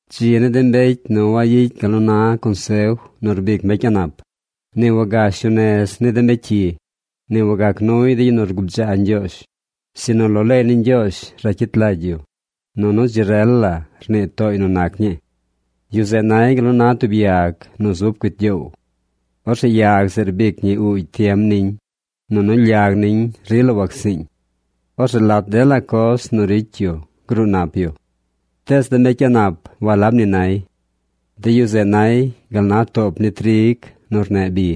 Dzi ni de mbecy nu wayicy gal nu na consef nu rbic mbecy a̱ꞌ nap, ni wagash yu nez ni de mbecy cyi, ni wagac nuy de yu nu rgubdzaa Ñgyoozh, sinu lo leey ni Ñgyoozh racyit lagy yu, nunu dzi rel la rnii tooy nu nac ñii. Yu zeꞌ nay gal nu na tub yag nu zub cuit gyoow. Orzeꞌ yag zeꞌ rbic ñi uugy tiem niñ, nunu lyag niñ rila wacsiiñ. Orzeꞌ lat dela coz nu ricy yu gruu nap yu. Tees de mbecy a̱ꞌ nap walab ni nay. De yu zeꞌ nay gal na toop ni trig nu rneꞌ bi.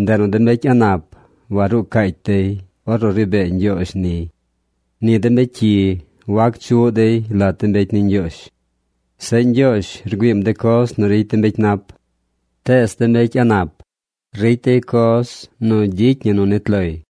Ndeꞌ nu de mbecy a̱ꞌ nap waruu cacy dey ornu ri bee Ñgyoozh niy. Ni de mbecy cyi wac chuꞌ dey lat de mbecy ni Ñgyoozh. Zeꞌ Ñgyoozh rgüiim de coz nu ricy de mbecy nap. Tees de mbecy a̱ꞌ nap, ricy dey coz nu ricy ñi nu nit loy.